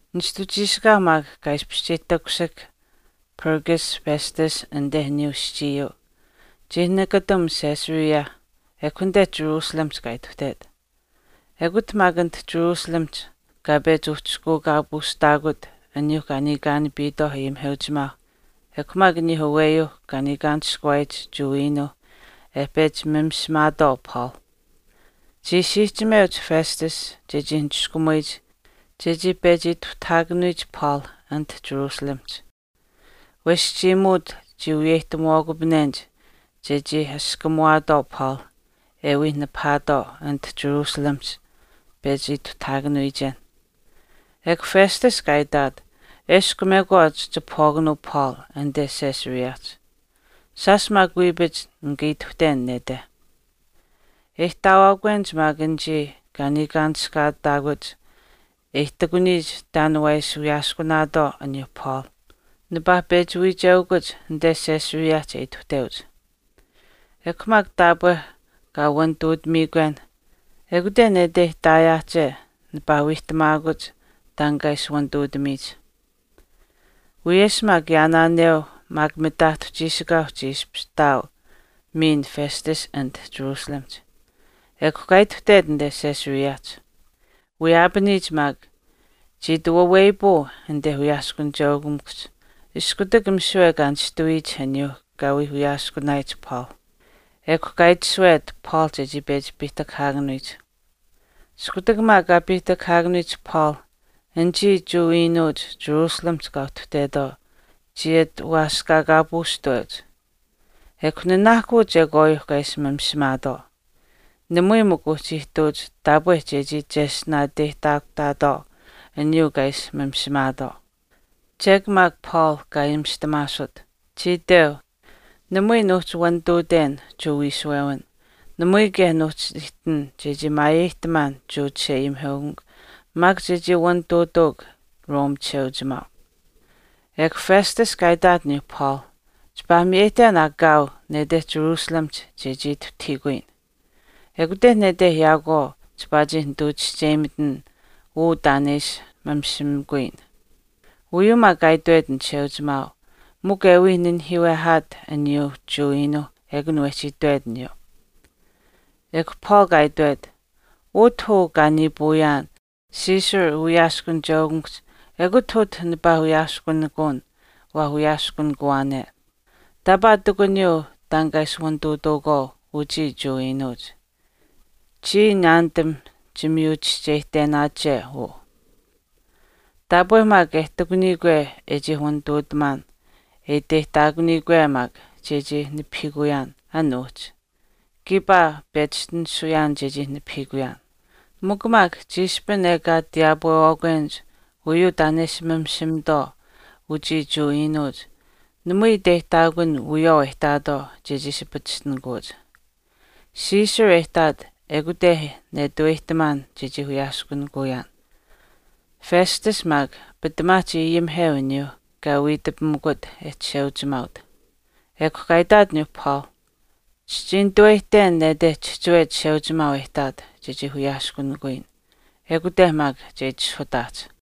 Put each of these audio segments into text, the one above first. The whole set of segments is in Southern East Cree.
Nishtu chiishikaau maak kaa ishpish chii takushihk Porcius Festus anite aniyuu aschiiyuu, chii nakatam Caesarea ekw anite Jerusalemihch kaa ituhtet. Ekut maak anit Jerusalemihch kaa pechi uhchishkuukaapuushtaakut aniyuuh kaa niikaanapiitwaau ayimiheuchimaauh ekw maak aniyuuh aweyuuh kaa niikaanishkuwaayich Jewa iinuuh e pechi mamishimaatwaau Paul. Chii siihchimeuch Festus chechii niskumuyich chechii pechi ituhtahaakanuyich Paul anit Jerusalemihch. Wesh chiimuut chii wiyeyihtamuwaakupanenich chechii askamuwaatwaau Paul e wii nipahaatwaau anite Jerusalemihch pechi ituhtahaakanuyichen. Ekw Festus kaa itaat, “Eshkw mekwaach chipahwaakanuu Paul anite Caesareahch. Shaash maak wiipach nika ituhten nete. E ihtaawaakwenich maak anichii kaa niikaanishkaataakuch e ihtakuniyich taan waa ishi wiyaaskunaatwaau aniyuuh Paul nipaa pechi wiicheukuch anite Caesareahch e ituhteuch. Ekw maak taapwe kaa wanituutamiikwen, ekute nete ihtaayaahche nipaa wiihtamaakuch taan kaa ishi wanituutamiyich.” Wiyesh maak yaanaaneu maak mitaahtu chiishikaau chii ishpish ihtaau miin Festus anit jerusalemihch. Ekw kaa ituhtet anite Caesareahch. Wiyaapaniyich maak, chii ati waweyapuu anite wiyaaskunicheukamikuhch iskutak misiwe kaa nishtawiyich aniyuu kaa wii wiyaaskunaayich Paul. Ekw kaa itashuwet Paul chechii pechi piihtakahaakanuyich. Iskutak maak kaa piihtakahaakanuyich Paul, anichii Jewa iinuuch Jerusalemihch kaa uhtuhtetwaau chii ati waaskaakaapuushtaweuch. Ekw nanaahkuu chekwaayuu kaa ishi mamishimaatwaau. Namui mikw uhchii ihtuuch taapwe chechii cheshtinaateyihtaakutaatwaau aniyuu kaa ishi mamishimaatwaau. Chek maak Paul kaa ayimishtamaasut. Chii itweu, “Namui nuuhchi wanituuten Jewa wiishuwewin. Namui kaye nuuhchi ihtin chechii maayeyihtamaan Jewa chisheayimiheukamikw maak chechii wanituutawak Rome chisheuchimaau.” Ekw Festus kaa itaat aniyuu Paul, “Chipaa miyeyihten aa kaau nete Jerusalemihch chechii ituhtahiikuyin. Ekute nete yaakwaau chipaa chii nituu chischeyimitin uu taan e ishi mamishimikuyin.” Uyuu maak kaa itwet an chisheuchimaau mikw e wii nanihiiwehaat aniyuu Jewa iinuuh ekun wehchii itwet aniyuu. Ekw Paul kaa itwet, “Utah uu kaa niipuuyaan Caesar uwiyaaskunicheukamikuhch ekut utah nipaa wiyaaskunikuun waa wiyaaskunikuwaane. Taapaa ihtakuniyuu taan kaa ishi waanituutuukwaau uchii Jewa iinuuch. Chiya naanitam chimiyuchischeyihtenaache uu. Taapwe maak e ihtakunikwe e chii wanituutamaan e iteyihtaakunikwe maak chechii nipahiikuyaan an uhchi, kiipaa pechishtinisuyaan chechii nipahiikuyaan. Mikw maak chiishpin ekaa tiyaapwewaakwenich uyuu taan e ishi mamishimitwaau uchii Jewa iinuuch namui iteyihtaakun wiyawaau e ihtaatwaau chechii ishi pachishtinikuuch. Caesar e ihtaat ekute e nituweyihtamaan chechii wiyaaskunikuyaan.” Festus maak, pitamaa chii ayimiheu aniyuu kaa wiitapimikut e chisheuchimaaut. Ekw kaa itaat aniyuu Paul, “Chichii nitaweyihten nete chihchiwe Chisheuchimaau e ihtaat chechii wiyaaskunikuyin. Ekute maak che itishahutaahch.”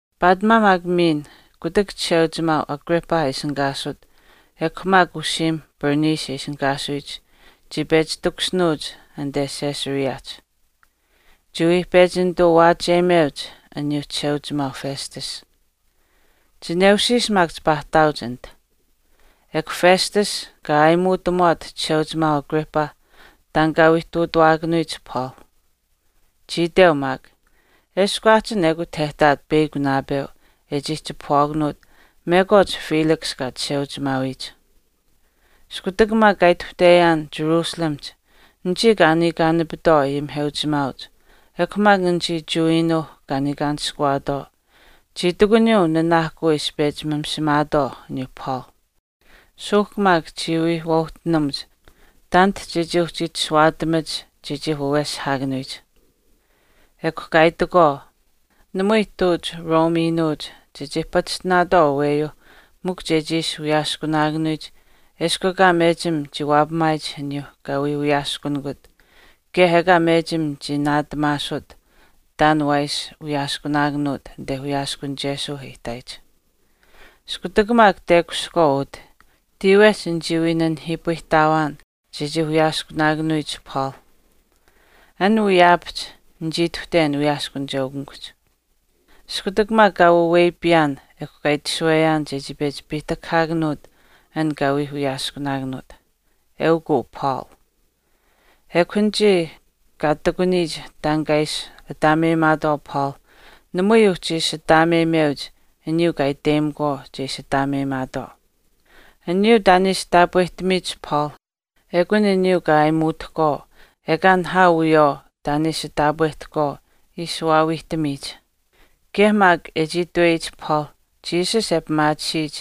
Paatimaa maak miin kutak chisheuchimaau Agrippa e ishinihkaasut ekw maak usiimh Bernice e ishinihkaasuyich chii pechi takushinuuch anite Caesareahch. Chii wii pechi nituu waachiyemeuch aniyuu chisheuchimaau Festus. Chineushiish maak chipaa ihtaauch anit. Ekw Festus kaa aayimuutamuwaat chisheuchimaauh Agrippa taan kaa wii ihtuutawaakanuyich Paul. Chii itweu maak, “Eshkw aahchin ekut e ihtaat peyakw naapeu e chii chipahwaakanuut mekwaach Felix kaa chisheuchimaawiyich. Iskutak maak kaa ituhteyaan Jerusalemihch anichii kaa niikaanapitwaau ayimiheuchimaauch ekw maak anichii Jewa iinuuh kaa niikaanishkuwaatwaau chii ihtakuniyuu nanaahkuu e ishi pechi mamishimaatwaau aniyuu Paul. Suuhk maak chii wii waauhtinamuch taanit chechii uhchi itashuwaatamach chechii waaweshihaakanuyich. Ekw kaa itakwaau, namui ihtuuch Rome iinuuch chechii pachishtinaatwaau aweyuu mikw chechii ishi wiyaaskunaakanuyich eshkw ekaa mechim chii waapamaayich aniyuu kaa wii wiyaaskunikut kaye ekaa mechim chii naatamaasuut taan waa ishi wiyaaskunaakanuut anite wiyaaskunichesuu e ihtaayich. Iskutak maak tekushihkwaau utah, tiiwehch nichii wii nanihiipayihtawaan chechii wiyaaskunaakanuyich Paul. An wiyaapahch nichii ituhten wiyaaskunicheukamikuhch. Iskutak maak kaa waweyapiyaan ekw kaa itashuweyaan chechii pechi piihtakahaakanuut an kaa wii wiyaaskunaakanuut, eukw uu Paul. Ekw anichii kaa ihtakuniyich taan kaa wiishi ataameyimaatwaau Paul namui uhchi ishi ataameyimeuch aniyuu kaa iteyimakwaau che ishi ataameyimaatwaau. Aniyuu taan e ishi taapwehtamiyich Paul ekun aniyuu kaa aayimuutahkwaau ekaa nihaau wiyawaau taan e ishi taapwehtahkwaau ishi waawiihtamiyich. Kaye maak e chii itweyich Paul Jesus e pimaatisiyich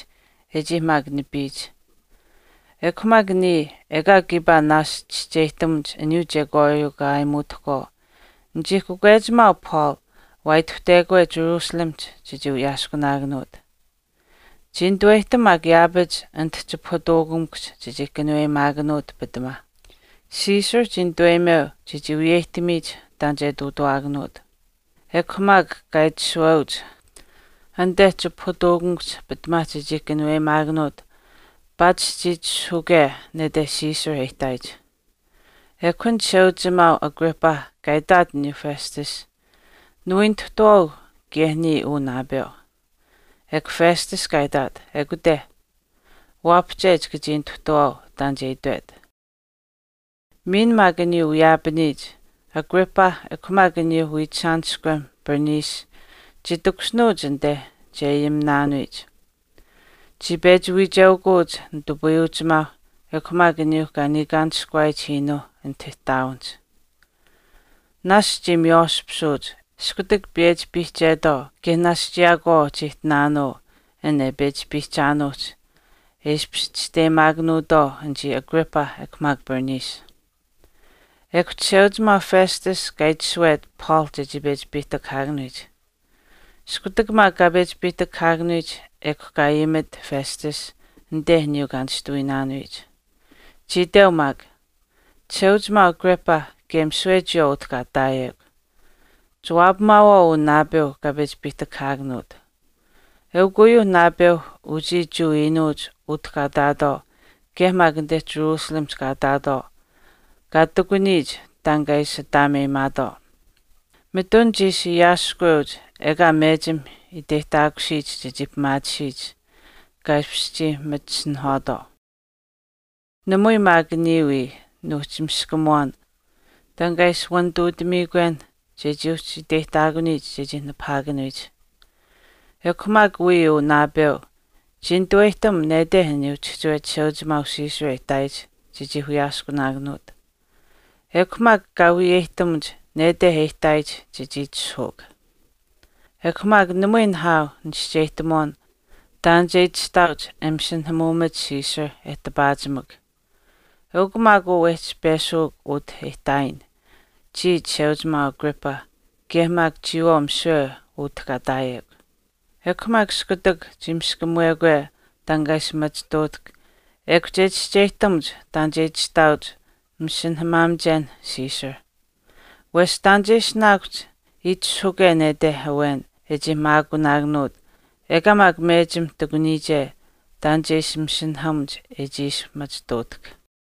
e chii maak nipiyich. Ekw maak niya ekaa kiipaa naashch chischeyihtamuch uyuu chekwaayuu kaa ayimitutahkwaau, nichii kakwechimaau Paul waa ituhtekwe Jerusalemihch chechii wiyaaskunaakanuut. Chii nituweyihtam maak yaapach anit chipahutuukamikuhch chechii kanuweyimaakanuut pitamaa. Caesar chii nituweyimeu chechii wiyeyihtamiyich taan che ihtuutawaakanuut. Ekw maak kaa itashuweuch anite chipahutuukamikuhch pitamaa chechii kanuweyimaakanuut paatish chii itishahuke nete Caesar e ihtaayich.” Ekw an chisheuchimaau Agrippa kaa itaat aniyuu Festus, “Niwii nituhtuwaau kaye niya uu naapeu.” Ekw Festus kaa itaat, “Ekute. Waapahche chika chii nituhtwaau taan che itwet.” Miin maak aniyuu wiyaapaniyich Agrippa ekw maak aniyuu wiichishaaniskwem Bernice chii takushinuuch anite che ayiminaanuyich. Chii pechi wiicheukuch nitupayuuchimaauh ekw maak aniyuu kaa niikaanishkuwaayich iinuu anit ihtaawinihch. Naashch chii miywaashpisuuch iskutak piyechi piihchetwaau kaye naashch yaakwaau chii ihtinaanuu an e pechi piihchaanuuhch e ishpish chisteyimaakanuutwaau anichii Agrippa ekw maak Bernice. Ekw chisheuchimaau Festus kaa itashuwet Paul chechii pechi piihtakahaakanuyich. Iskutak maak kaa pechi piihtakahaakanuyich ekw kaa ayimit Festus anite aniyuu kaa nishtuwiinaanuyich. Chii itweu maak, “Chisheuchimaau Agrippa kaye misiwe chiyawaau utah kaa ihtaayekw, chiwaapamaawaau uu naapeu kaa pechi piihtakahaakanuut. Eukw uyuu naapeu uchii Jewa iinuuch utah kaa ihtaatwaau kaye maak anite Jerusalemihch kaa ihtaatwaau kaa ihtakuniyich taan kaa ishi ataameyimaatwaau. Mitun chii ishi aasihkweuch ekaa mechim iteyihtaakusiyich chechii pimaatisiyich kaa ishpish chii machisinihwaatwaau. Namui maak niya wii nuuhchi miskamuwaan taan kaa ishi wanituutamiikwen chechii uhchi iteyihtaakuniyich chechii nipahaakanuyich. Ekw maak wiya uu naapeu chii nituweyihtam nete aniyuu chihchiwe chisheuchimaau Caesar e ihtaayich chechii wiyaaskunaakanuut. Ekw maak kaa wiyeyihtamuch nete e ihtaayich chechii itishahuuk. Ekw mikw namui nihaau nichischeyihtamuwaan taan che itashtaauch e masinahamaamach Caesar e tipaachimak. Eukw maak uu wehchii peshuuk utah e ihtaayin chii chisheuchimaau Agrippa kaye maak chiyawaau misiwe utah kaa ihtaayekw. Ekw maak iskutak chii miskamuwekwe taan kaa ishi machituutahk, ekw che chischeyihtamuch taan che itashtaauch masinahamaamichen Caesar. Wesh taan che ishinaakuhch itishahuke nete awen e chii maakunaakanuut ekaa maak mechim ihtakuniyiche taan chechii ishi masinahamuch e chii ishi machituutahk.”